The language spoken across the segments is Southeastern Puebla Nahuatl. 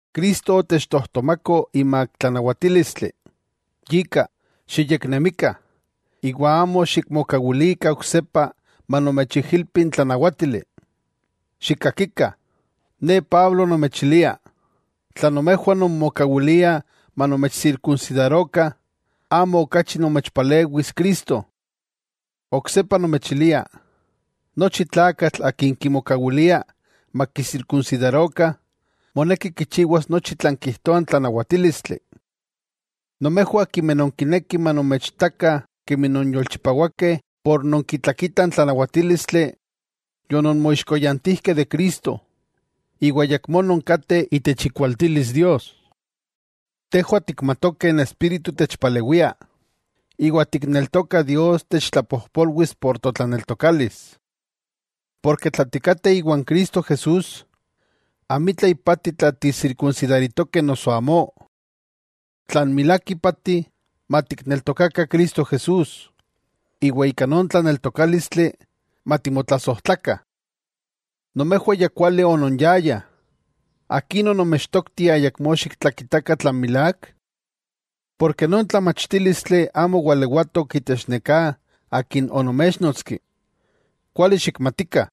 Cristo otechtojtomako imak tlanawatílistli. Yika xiyeknemikah, iwa amo xikmokawilikah oksepa manomechijilpi n tlanawátili. ¡Xikkakikah! Ne Pablo, nomechilia: Tla nomejwah nonmokawiliah manomechsirkunsidarokah, amo okachi nomechpalewis Cristo. Oksepa nomechilia, nochi tlakatl akin kimokawilia makisirkunsidarokah moneki kichiwas nochi tlan kijtoa n tlanawatílistli. Nomejwah akimeh nonkinekih manomechitakah kemi non yolchipawakeh por nonkitlakitah n tlanawatílistli, yononmoixkoyantijkeh de Cristo, iwa ayakmó nonkateh itech ikualtilis Dios. Tejwah tikmatokeh n Espíritu techpalewia, iwa tikneltokah Dios techtlapojpolwis por totlaneltokalis. Porke tla tikateh iwan Cristo Jesús, amitla ipati tla tisirkunsidaritokeh noso amó. Tlan milák ipati, matikneltokakah Cristo Jesús, iwa ika non tlaneltokálistli matimotlasojtlakah. Nomejwah ya kuali ononyayah. ¿Akin onomechtoktih ayakmó xiktlakitakah tlan milák? Porke non tlamachtílistli amo walewatok itech neká akin onoméchnotski. Kuali xikmatikah: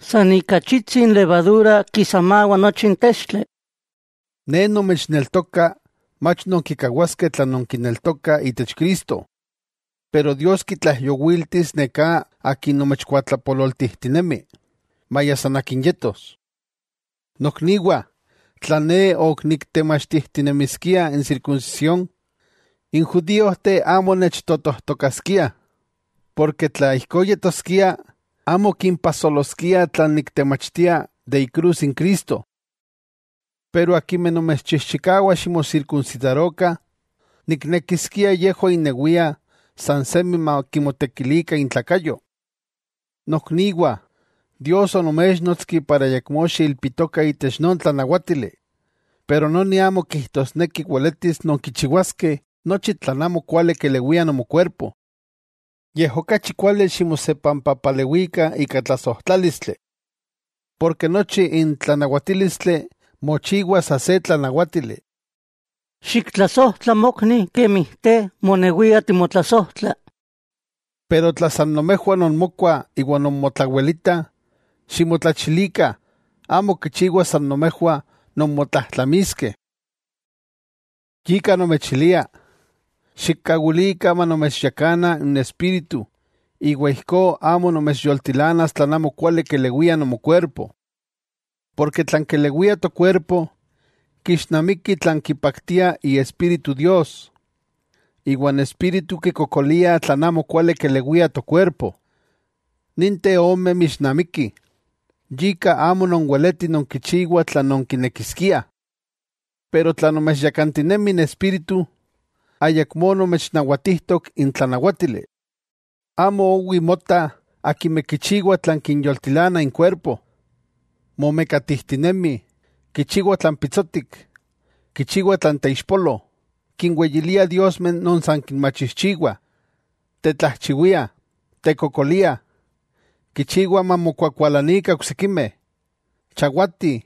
“San ika achitsi levadura kisamawa nochi n textli.” Ne nomechneltoka mach nonkikawaskeh tlan nonkineltokah itech Cristo. Pero Dios kitlaijyowiltis neká akin nomechkuatlapololtijtinemi, maya san akin yetos. Nokniwah, tla ne ok niktemachtijtinemiskia n sirkunsisión, n judíojteh amo nechtotojtokaskiah, porke tla ijkó yetoskia, amo kimpajsoloskia tlan niktemachtia de ikrus n Cristo. Pero akimeh nomechchijchikawah ximosirkunsidarokah, ¡niknekiskia yejwah innewiah san semi makimotekilikah intlakayo! Nokniwah Dios onoméchnotski para ayakmó xiilpitokah itech non tlanawátili, pero noni amo kijtosneki weletis nonkichiwaskeh nochi tlan amokuali kelewia nomokuerpo. Yej okachi kuali ximosepampapalewikah ika tlasojtlálistli. Porke nochi n tlanawatílistli mochiwa sa se tlanawátili: “Xiktlasojtla mokni kemi te monewia timotlasojtla.” Pero tla san nomejwah nonmokuah iwa nonmotlawelitah, ximotlachilikah, amo kichiwa san nomejwah nonmotlajtlamiskeh. Yika nomechilia: Xikkawilikah manomechyakana n Espíritu, iwa ijkó amo nomechyoltilanas tlan amokuali kelewia nomokuerpo. Porke tlan kelewia tokuerpo, kixnamiki tlan kipaktia Iespíritu Dios, iwa n Espíritu kikokolia tlan amokuali kelewia tokuerpo. Ninteh ome mixnamikih, yika amo nonweletih nonkichiwah tlan nonkinekiskiah. Tla nomechyakantinemi n Espíritu, ayakmó nomechnawatijtok n tlanawátili. Amo owi motah akimeh kichiwah tlan kinyoltilana inkuerpo: momekatijtinemih, kichiwah tlan pitsotik, kichiwah tlan teixpolo, kinweyiliah diosmeh non san kinmachijchiwah, tetlajchiwiah, tekokoliah, kichiwah mamokuakualanikah oksikimeh, chawatih,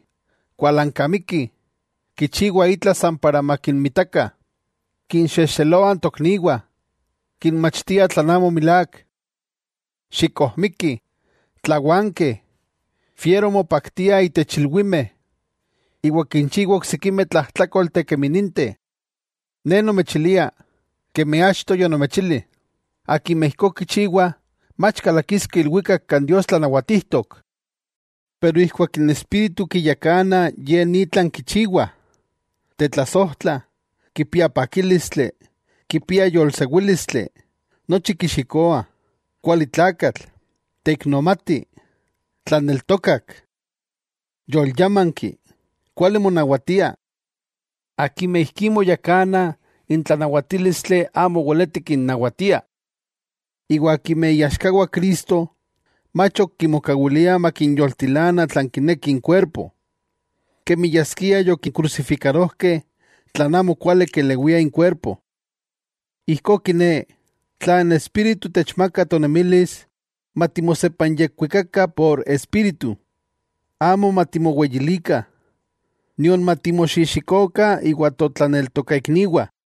kualankamikih, kichiwah itla san para makinmitakah, kinxexeloah n tokniwah, kinmachtiah tlan amo milák, xikojmikih, tlawankeh, fiero mopaktiah itech ilwimeh, iwa kinchiwah oksikimeh tlajtlákolteh kemi ninteh. Ne nomechilia, kemi achto yonomechili, akimeh ijkó kichiwah, mach kalakiskeh ilwikak kan Dios tlanawatijtok. Pero ijkuak n Espíritu kiyakana se tlakatl, ye ni tlan kichiwah: tetlasojtla, kipia pakílistli, kipia yolsewílistli, nochi kixikoa, kuali tlakatl, teiknomati, tlaneltokak, yolyamanki, kuali monawatia. Akimeh ijkí moyakanah n tlanawatílistli amo weleti kinnawatia. Iwa akimeh iaxkawah Cristo, mach ok kimokawiliah makinyoltilana tlan kineki inkuerpo, kemi yaskia yokikrusifikarojkeh tlan amo kuali kelewia inkuerpo. Ijkó kiné, tla n Espíritu techmakah tonemilis matikmokawilikah matechyakana n Espíritu. Amo matimoweyilikah, nion matimoxijxikokah iwan totlaneltokaikniwah.